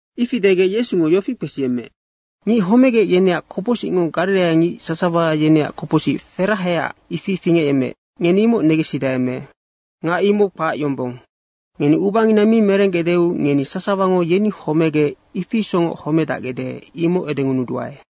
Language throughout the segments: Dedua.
Ifi degec Yesungo yofi kpesiyemmeec, “Ngic homegec, yeneac kopocsicngo gariraiangic sasawa yeneac kopocsic ferahaecac ifi fingecyemmeec, ngeni imoc negensidae me? Nga imoc kpac yombong. Ngeni ubangina mi merenggecdeu ngeni sasawango yeni homegec, ifi isocngoc homedacgecde, imoc edengunuduae.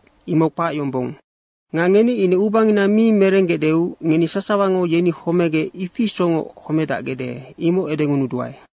Imoc kpac yombong. Nga ngeni ine ubangina mi merenggecdeu ngeni sasawango yeni homegec, ifi isocngoc homedacgecde, imoc edengunuduae.”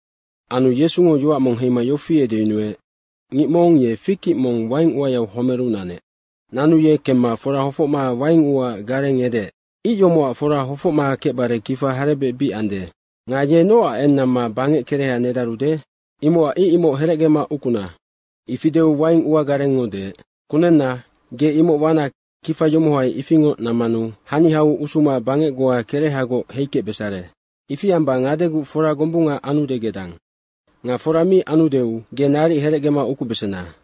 Anu Yesungo yoac mong heima yofi edeyunuec, “Ngic mong ye fig ic mong waing uayau homeru nanec. Nanu ye kemma fora hofocma waing uaac gareng edeec, ‘Ic yomocac fora hofocma kecbare kifa harebec bic ande nga ye nocac eng namma bangec kereha nedarude? Imocac ic imoc herecgema ukuna.’ Ifi deu waing uagarengngo deec, ‘Kunenna, ge imoc wana kifa yomohai ifingoc nammanu haniau usuma bangec goa kerehagoc heikecbesare. Ifi amba ngadeguc fora gombunga anude gedang. Nga fora mi anudeu ge naric herecgema ukubesena.’”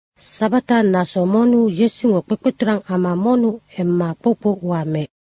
Sabata naso monnu Yesungo kpekpeturang ama monnu emma kpoukpou ua meec.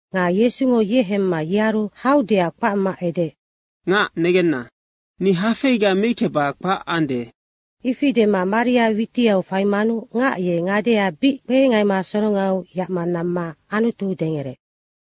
Nga Yesungo ye hemma yearu haudeac kpacma edeec, “Ngac negenna, ni hafeiga meickeba kpac ande.” ifi dema maria witiau faimanu ngac ye ngadea bic kpehengaima sorongaiu yacma namma Anutu dengereec.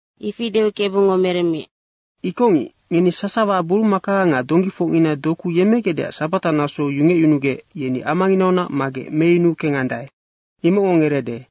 Ifi deu Kebungo meremmiec, “Ikocngic, ngeni sasawa burumaka nga donggifocngina doku yemmegecdeac sabata nasou yungecyunugec, yeni amanginaunac magec meyunu kengandae, imocngo ngereede.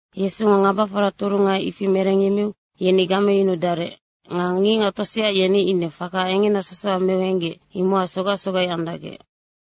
Yesungo ngabafora turunga ifi merengyemmeu yeni gameyunudarec. Nga ngicngac tosea yeni ine faka engena sasawa meu henggec, imocac sogac sogai andacgec.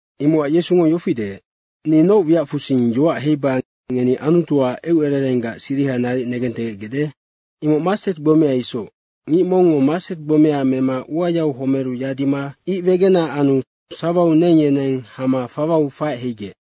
Imocac Yesungo yofi deec, “Ni noc wiacfusing yoac heiba ngeni Anutuac eucererenggac siriha naric negentegecgecde? Imoc mastet gbomea isoc, ngic mongngo mastet gbomea mema uayau homeru yadima ic wegena anu sawau neng yeneng hama fawau faec heigec.”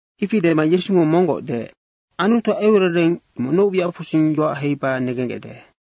Ifi dema Yesungo monggoc deec, “Anutuac eucerereng, imoc noc wiacfusing yoac heiba negenggecde,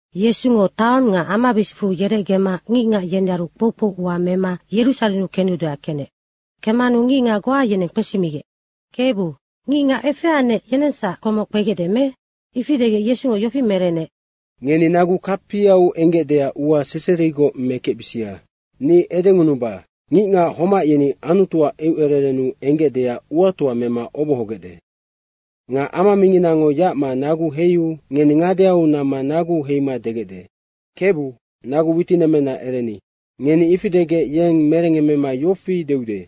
Yesungo taong nga amabisicfu yerecgema ngicngac yenearu kpoukpou ua mema Yerusarennu kenudeac kenec. Kemmanu ngicngac goa yeneng kpesimigec, “Kebu, ngicngac efeanec, yenengsac komoc kpegecde me?” ifi degec Yesungo yofi merenec, “Ngeni nagu kapiau enggecdeac ua seserigoc mekecbisia. Ni edengunuba, ngicngac homac yeni Anutuac eucererennu enggecdeac uatoa mema obohogecde. Nga ama minginango yacma nagu heiu ngeni ngadeau namma naguu heima degecde, ‘Kebu, nagu witinemmena ereni.’ Ngeni ifi degec yeng merengngemmema yofi deude,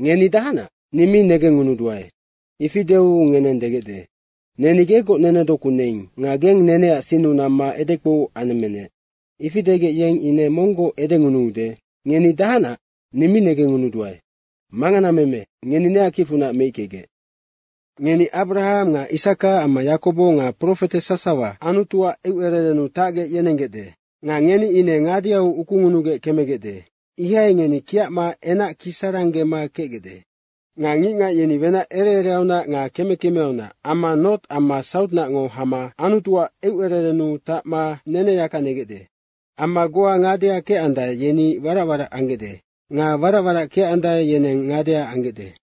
‘Ngeni dahacnac? Ni mi negengngunuduae.’ Ifi deu ngeneng degecde, ‘Neni gegoc nenedoku neing nga geng neneac sinnu namma edekpou anemmenec.’ Ifi degec, yeng ine monggoc edengunuude, ‘Ngeni dahacnac? Ni mi negengngunuduae. Manganameme, ngeni neac kicfunac meickegec.’ Ngeni Abrahang nga Isaka amma Yakobo nga profete sasawa Anutuac eucererennu tacgec yenenggecde. Nga ngeni ine ngadeau ukungunugec kemegecde. Ihai ngeni kiacma enac kisaranggema kecgecde. Nga ngicngac yeni wenac ere ereaunac nga keme kemeaunac amma nort amma sautnacngo hama Anutuac eucererennu tacma neneyaka negecde. Amma goa ngadea kecandae, yeni warac warac anggecde nga warac warac kecandae, yeneng ngadea anggecde.”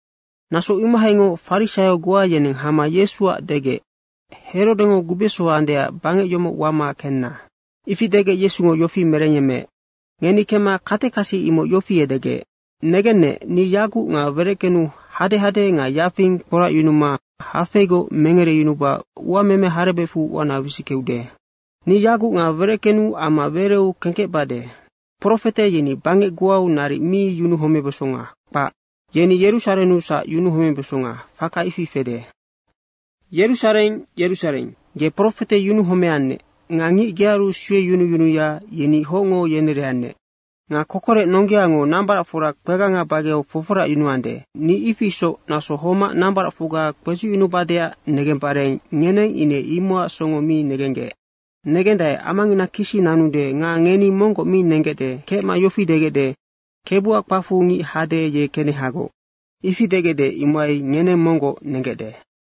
Naso imohaingoc farisaio goa yeneng hama Yesuac degec, “Herodengo gubeso andeac bangec yomoc wama kenna.” Ifi degec Yesungo yofi merengyemmeec, “Ngeni kemma katekasi imoc yofi edegec, ‘Negennec, ni yaguc nga wereckenu hadehade nga yafing kporacyunuma hafeigoc mengereyunuba uameme harebecfu uana wisickeude. Ni yaguc nga wereckenu amma wereu kengkecbade. Profete yeni bangec goau naric mi yunuhomebesonga, kpac. Yeni Yerusarennusac yunuhomebesonga, faka ifi fede.’ Yerusareng Yerusareng, ge profete yunuhomeannec nga ngic gearu sueyunuyunuya, yeni hocngo yenereannec. Nga Kokorec nonggeango nambaracfora kpeganga bageau foforacyunuande, ni ifi isoc naso homac nambaracfocga kpedzucngunubadeac negembare ngeneng ine imocac songo mi negenggec. Negendae, amangina kisi nanude nga ngeni monggoc mi nenggecde kecma yofi degecde, ‘Kebuac kpacfu ngic hade, ye kenehagoc.’ ifi degecde, imohai ngeneng monggoc nenggecde.”